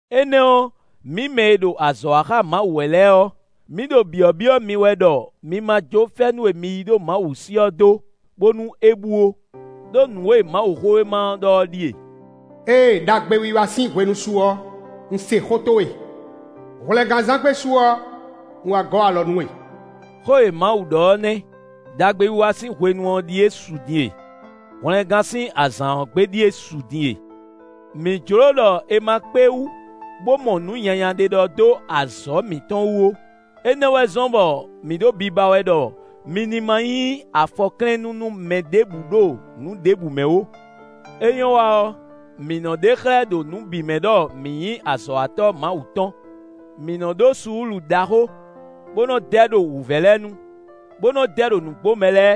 Énɛ́ ɔ́, mǐ mɛ e ɖo azɔ̌ wa xá Mawu wɛ lɛ́ɛ ɔ́, mǐ ɖo byɔ̌byɔ́ mi wɛ ɖɔ mi ma jó fɛ́nú e mi yí ɖo Mawu sí ɔ́ dó, bónú é bú ó. Đó nǔ e Mawuxówéma ɔ́ ɖɔ é ɖíe: “Ée ɖagbewiwa sín hwenu su ɔ́, un se xó towe; hwlɛngánzán gbe su ɔ́, un wá gɔ́ alɔ nú we.” Xó e Mawu ɖɔ ɔ́ nɛ́. Đagbewiwa sín hwenu ɔ́ ɖíe su din e; hwlɛngán sín azǎn ɔ́ gbe ɖíe su din e. Mǐ jló ɖɔ è ma kpé wú bó mɔ nǔ nyanya ɖé ɖɔ dó azɔ̌ mǐtɔn wú ó; énɛ́ wɛ zɔ́n bɔ mǐ ɖo biba wɛ ɖɔ mǐ ní ma nyí afɔklɛ́nnú nú mɛ ɖěbǔ ɖo nǔ ɖěbǔ mɛ ó. É nyɔ́ wa ɔ́, mǐ nɔ́ ɖe xlɛ́ ɖo nǔ bǐ mɛ ɖɔ mǐ nyí azɔ̌watɔ́ Mawu tɔn: mǐ nɔ́ ɖó suúlu ɖaxó, bó nɔ́ dɛ ɖo wǔvɛ́ lɛ́ɛ nu, bó nɔ́ dɛ ɖo nǔgbomɛ lɛ́ɛ,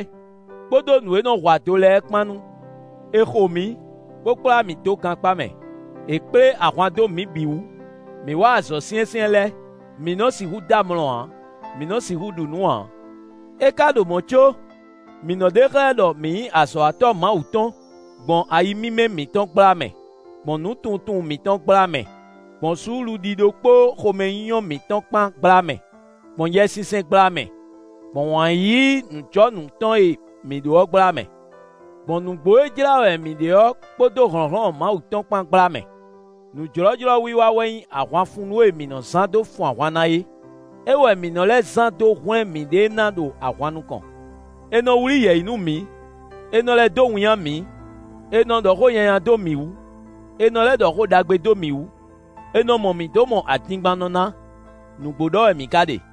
kpódó nǔ e nɔ́ hu ado lɛ́ɛ kpán nu. È xo mǐ, bó kplá mǐ dó gankpá mɛ; è kplé ahwan dó mǐ bǐ wú; mǐ wa azɔ̌ syɛ́nsyɛ́n lɛ́ɛ; mǐ nɔ sixú dɔ́ amlɔ ǎ; mǐ nɔ́ sixú ɖu nǔ ǎ. É ka ɖo mɔ̌ có, mǐ nɔ́ ɖe xlɛ́ ɖɔ mǐ nyí azɔ̌watɔ́ Mawu tɔn gbɔn ayi mímɛ́ mǐtɔn gbla mɛ, gbɔn nǔtunwuntunwun mǐtɔn gbla mɛ; gbɔn suúlu ɖíɖó kpó xomɛnyínyɔ́ mǐtɔn kpán gbla mɛ; gbɔn Yɛsinsɛn gbla mɛ; gbɔn wǎn yíyí nǔjɔnǔ tɔn e mǐ ɖó ɔ́ gbla mɛ. Gbɔn nǔgbó e jlá wɛ mǐ ɖe ɔ́, kpódó hlɔ̌nhlɔ́n Mawu tɔn kpán gbla mɛ. Nǔ jlɔ́jlɔ́ wiwa wɛ nyí ahwanfunnú e mǐ nɔ́ zán dó fun ahwan ná é; é wɛ mǐ nɔ́ lɛ́ zán dó hwlɛ́n mǐɖée ná ɖo ahwan nukɔn. È nɔ wlí yɛ̌yi nú mǐ; è nɔ lɛ́ dó winnyá mǐ; è nɔ ɖɔ xó nyanya dó mǐ wú; è nɔ lɛ́ ɖɔ xó ɖagbe dó mǐ wú. È nɔ mɔ mǐ dó mɔ adingbannɔ ná; nǔgbó ɖɔ wɛ mǐ ka ɖe.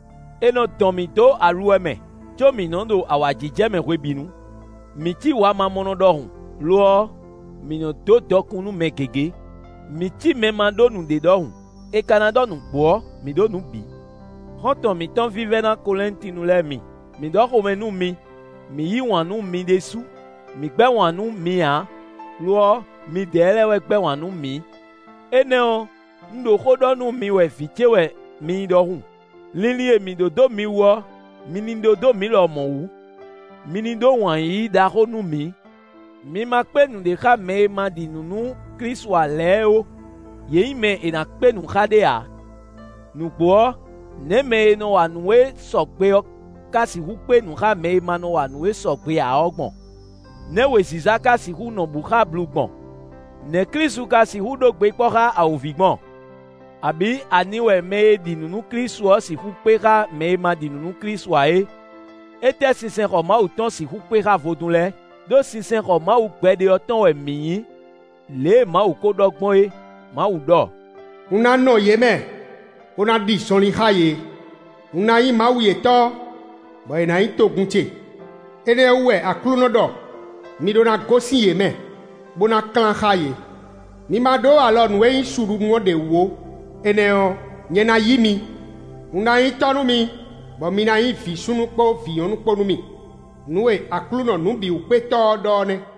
È nɔ dɔn mǐ dó aluwɛ mɛ, có mǐ nɔ́ ɖo awǎjijɛ mɛ hwebǐnu; mǐ cí wamamɔnɔ ɖɔhun; lo ɔ́, mǐ nɔ́ dó dɔkun nú mɛ gěgé; mǐ cí mɛ e ma ɖó nǔɖé ɖɔhun, è ka ná ɖɔ nǔgbó ɔ́, mǐ ɖó nǔ bǐ. Xɔ́ntɔn mǐtɔn vívɛ́ná Kɔlɛ́ntinu lɛ́ɛ mi, mǐ ɖɔ xomɛ nú mi; mǐ yí wǎn nú mi ɖésú. Mǐ gbɛ́ wǎn nú mi ǎ; lo ɔ́, midɛɛ lɛ́ɛ wɛ gbɛ́ wǎn nú mǐ. Énɛ́ ɔ́, un ɖo xó ɖɔ nú mi wɛ vǐ ce wɛ mi nyí ɖɔhun: linlin e mǐ ɖó dó mi wú ɔ́, mi ní ɖó dó mǐ lɔmɔ̌ wú; mi ní ɖó wǎn yíyí ɖaxó nú mǐ. Mi ma kpé nǔɖé xá mɛ e ma ɖi nǔ nú Klísu ǎ lɛ́ɛ ó: yě nyí mɛ e è nǎ kpé nǔ xá ɖé ǎ. Nǔgbó ɔ́, nɛ̌ mɛ e nɔ wa nǔ e sɔgbe ɔ́ ká sixú kpé nǔ xá mɛ e ma nɔ wa nǔ e sɔgbe ǎ ɔ́ gbɔn? Nɛ̌ wěziza ka sixú nɔ bǔ xá ablu gbɔn? Nɛ̌ Klísu ka sixú ɖó gbe kpɔ́ xá awǒvi gbɔn? Abǐ ani wɛ mɛ e ɖi nǔ nú Klísu ɔ́ sixú kpé xá mɛ e ma ɖi nǔ nú Klísu ǎ é? Étɛ́ sinsɛnxɔ Mawu tɔn sixú kpé xá vodún lɛ́ɛ? Đó sinsɛnxɔ Mawu gbɛɖe ɔ́ tɔn wɛ mǐ nyí, lě e Mawu ko ɖɔ gbɔn é; Mawu ɖɔ: “Un ná nɔ yě mɛ, bó ná ɖi zɔnlin xá yě; un ná nyí Mawu yětɔn, bɔ yě ná nyí togun ce.” Énɛ́ ɔ́ wú wɛ Aklúnɔ ɖɔ: “Mi ɖó ná gosín yě mɛ, bó ná klán xá yě; mi ma ɖó alɔ nǔ e nyí suɖunú ɔ́ ɖě wú ó, énɛ́ ɔ́, nyɛ ná yí mi. Un ná nyí tɔ́ nú mi, bɔ mi ná nyí vǐ súnnu kpó vǐ nyɔ̌nu kpó nú mì; nǔ e Aklúnɔ Nǔbǐwúkpétɔ́ ɔ́ ɖɔ ɔ́ nɛ́.”